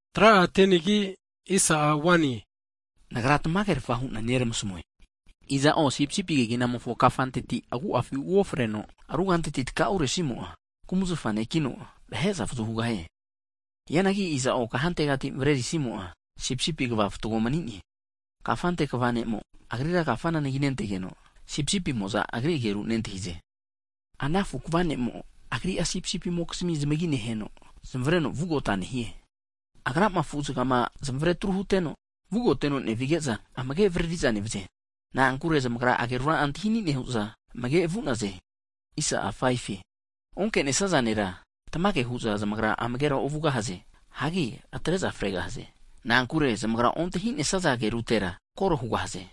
Jisasi'a mago'ene amanage hu'ne, Nagra tamagerafa hu'na neramasmue, iza'o sipisipi keginamofo kafanteti agu'afi uofreno, ruganteti taka'uresimo'a, kumzafa vahe mani'neno, vahe'za avazu hugahie. Hianagi iza'o kahantegati ufresimo'a sipisipi kva fatgo mani'ne. Kafante kva ne'mo agrira kafana anagintegeno, sipisipimo'za agri ageru nentahize. Ana afu kva ne'mo Agri'a sipisipimokizmi zamagi neheno, zamavareno vugota nehie. Agrama sipisipi afu'zaga'ama zamavare atru huteno, vugoteno nevige'za, amage' avriri'za nevze. Na'ankure zamagra agerura antahi ani' nehu'za amage nevaze. Onke'nesaza vahera, tamage hu'za zamagra amagera ovugahaze. Hagi atre'za fregahaze, na'ankure zamagra ontahi'nesaza agerutera kore hugahaze. Hagi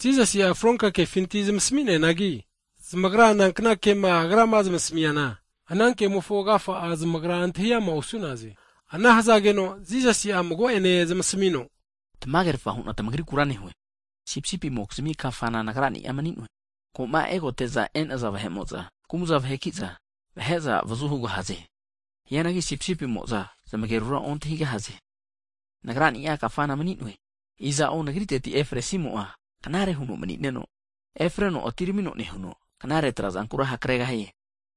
Jisasi'a fronka kefinti zamasmineanagi, zamagra nankna kema Agrama zamasmiana, ana kemofo agafa'a antahi amara osu'naze. Ana hazageno Jisasi'a mago'ene zamasmino, Tamagerfa hu'na tmagrikura nehue, Sipisipimokizmi kafana Nagra'ni'a mani'noe. Ko'ma egote'za e'naza vahe'mo'za, kumza vahekiza, vahe'za avazu hugahaze. Hianagi sipisipimo'za zamagerura ontahigahaze. Nagra'ni'a kafana mani'noe, iza'o Nagri'teti efresimo'a knare huno mani'neno, efreno atiramino nehuno knare tra'zankura hakregahie.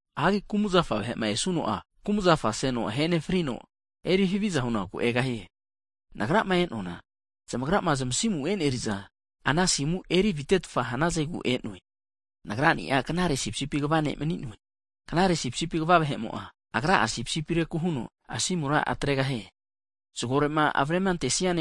Hanki kumzafa vahe'ma ne-eana kumzafa seno, ahe nefrino, eri haviza hunakuke egahie. Nagrama e'noana zamagra zamasimu e'neri'za, ana asimu eri avitetfa hanazegu e'noe. Nagra'ni'a knare sipisipi kva ne' mani'noe, Knare sipisipi kva vahe'mo'a Agra'a sipisipireku huno asimura atregahie. Zago erinakuma avrema antesigeno eri'zama erisia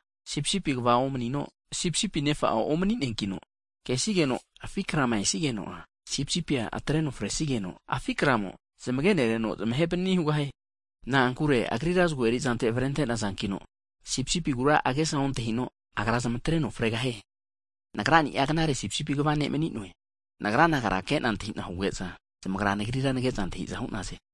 ne'mo'a, sipisipi kva omanino sipisipi nefa'a omani'neankino, kesigeno afi krama esigeno'a, sipisipia atreno fresigeno, afi' kramo (wulf) zamagene reno zamahe panani hugahie. Na'ankure agrira zago erizante avrente'nazankino sipisipigura agesa ontahino, agra zamatreno fregahie. Nagra'ni'a knare sipisipi kva mani'noe, Nagra sipisipi nagani'a ke'na antahi'na huge'za, zamagra Nagrira nage'za nantahi'za hu'naze.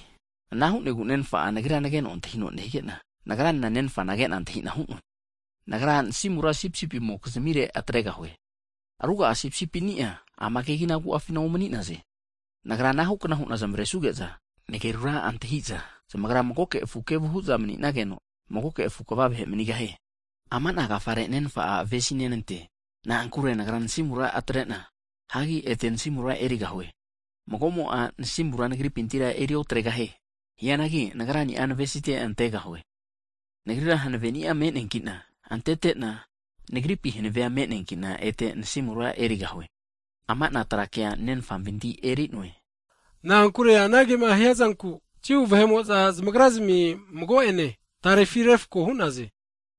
Anahukna huno Nenfa'a, Nagrira nageno antahino hige'na, Nagra Nenfana age'na antahi'na hu'noankina, Nagra nasimura sipisipimokizmire atregahue. Ruga'a sipisipini'a ama kegina agu'afina omani'naze, Nagra anahu kna hu'na zamaresuge'za, nagerura nentahi'za, zamagra magoke afu kevu hu'za mani'nageno, magoke afu kva vahe manigahie. Ama'na agafare Nenfa'a avesi'nenante, na'ankure Nagra nasimura atretena, hagi ete nasimura erigahue. Mago'mo'a nasimura Nagripintira eriotre'gahie, hianagi Nagra'ni'a navesite antregahue. Nagrira hanaveni'a me'neankina antete'na, Nagripi hanavea me'neankina ete nasimura erigahue. Ama'na kea Nenfa huhanavetino hunanteno huo hu'neankina hugahue. Hagi anagema hiazanku, Jiu vahe'mo'za zamagra'zmi mago'ene tarefi refko hu'naze.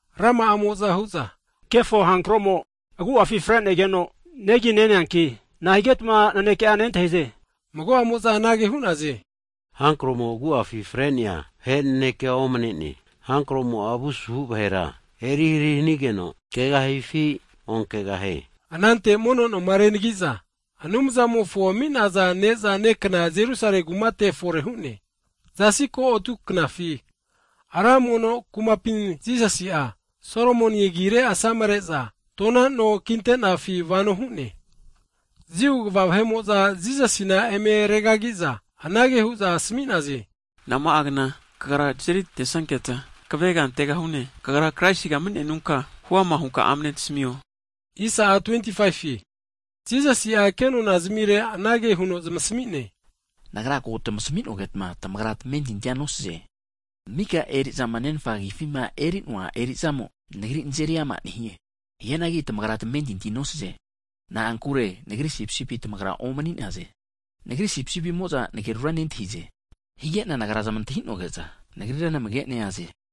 Rama'amo'za hu'za, Kefo hankro'mo agu'a fre'negeno negi neneanki, nahigetma naneke'a nentahi'ze? Mago'amo'za anage hu'naze, kefo hankro'mo agu'afi fre'nea vahe nanekea omne'ne. Kefo hankromo'a avu asuhu vahera erihari hanigeno kegahifi, onkegahie? Anante mono noma renagi'za Anumzamofo ami'naza knagu antahimi'za ne'za nenazankna Jerusalemi kumate fore hu'ne. Zasi ko atu knafi, Ra mono kumapi Jisasi'a, Solomon agire asamare'naza no kinte'nafi vano hu'ne. Jiu kva vahe'mo'za Jisasina eme regagi'za, anage hu'za asmi'naze, Nama'a kna kagra tazeri antesanketa kvega antegahune? Kagra Kraisiga mani'nenunka huama hunka amne tasmio. Hageno Jisasi'a kenona zamire anage huno zamasmi'ne, Nagra ko tamasmi'nogetma, tamagra tamentinti nosaze, mika eri'zama Nenfa agifima enerua eri'zamo, Nagrira nazeri ama nehie. Hianagi tamagra tamentintia nosaze, na'ankure Nagri sipisipia tamagra omani'naze. Nagri sipisipimo'za nagerura nentahize, hige'na Nagra zmagena antahina hu'noge'za, zamagra Nagrira namage neaze.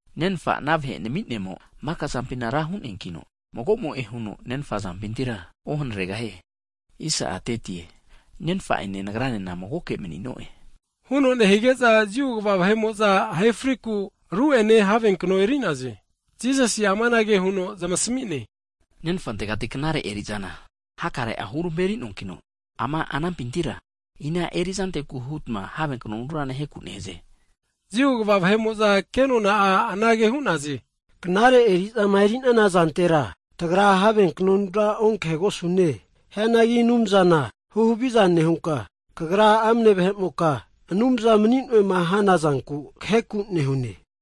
Nenfa'ma ana vahe nami'nemo, maka zampina ra mani'neankino, mago'moe huno Nenfa azampintira ohanaregahie. Nenfa'ene, Nagranena magoke mani'no'e. Huno nehige'za Jiu kva vahe'mo'za ahe frinaku ru'ene havenkno eri'naze. Hagi Jisasi'a amanage huno zamasmi'ne, Nenfantegati knare eri'zana hakare'a hurmeri'noanki, ama anampintira ina erizanteku hutma have knonura naheku nehaze? Jiu kva vahe'mo'za ke nona'a anage hu'naze, knare eri'zama eri'nana zantera tagra have knonura onkahe'gosune, hianagi Anumzana huhaviza nehunka, kagra amne vahe'moka, Anumza mani'noema hanazanku kaheku nehune.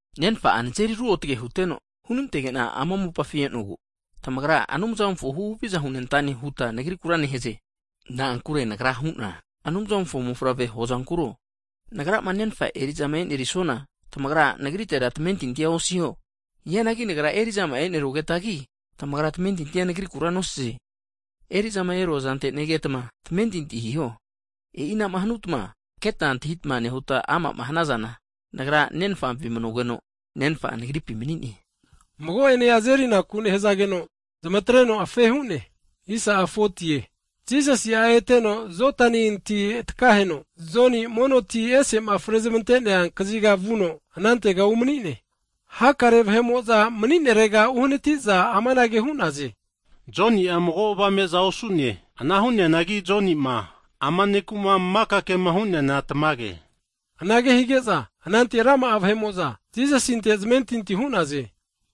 Nenfa'a nazeri ruotge huteno, hunantege'na ama mopafi e'nogu, tamagra Anumzamofo huhaviza hunentane huta Nagrikura nehaze, na'ankure Nagra hu'na Anumzamofo mofavre mani'noe huazankuro? Nagrama Nenfa eri'zama e'norisuana, tamagra Nagritera tamentintia osiho. Hianagi Nagra eri'zama'a e'nerugetagi, tamagra tamentintia Nagrikura nosaze, eri'zama eruazante negetma tamentinti hiho, e'inama hanuta keta antahita hanazana, Nagra Nenfampi manugeno, Nenfa'a Nagripi mani'ne hugahaze. Mago'ene azerinaku nehazageno, zamatreno rufanene hu'ne. Jisasi'a eteno Jodani ti takaheno Joni'ma mono ti ese'ma frezmante'nea kaziga vuno, anantega umani'ne. Hakare vahe'mo'za mani'nerega uhanati'za amanage hu'naze, Joni'a mago avame'za osu'ne, ana hu'neanagi Joni'ma ama ne'ku'ma maka kema hu'neana tamage hu'ne. Anage hige'za, anante rama'a vahe'mo'za Jisasinte zamentinti hu'naze.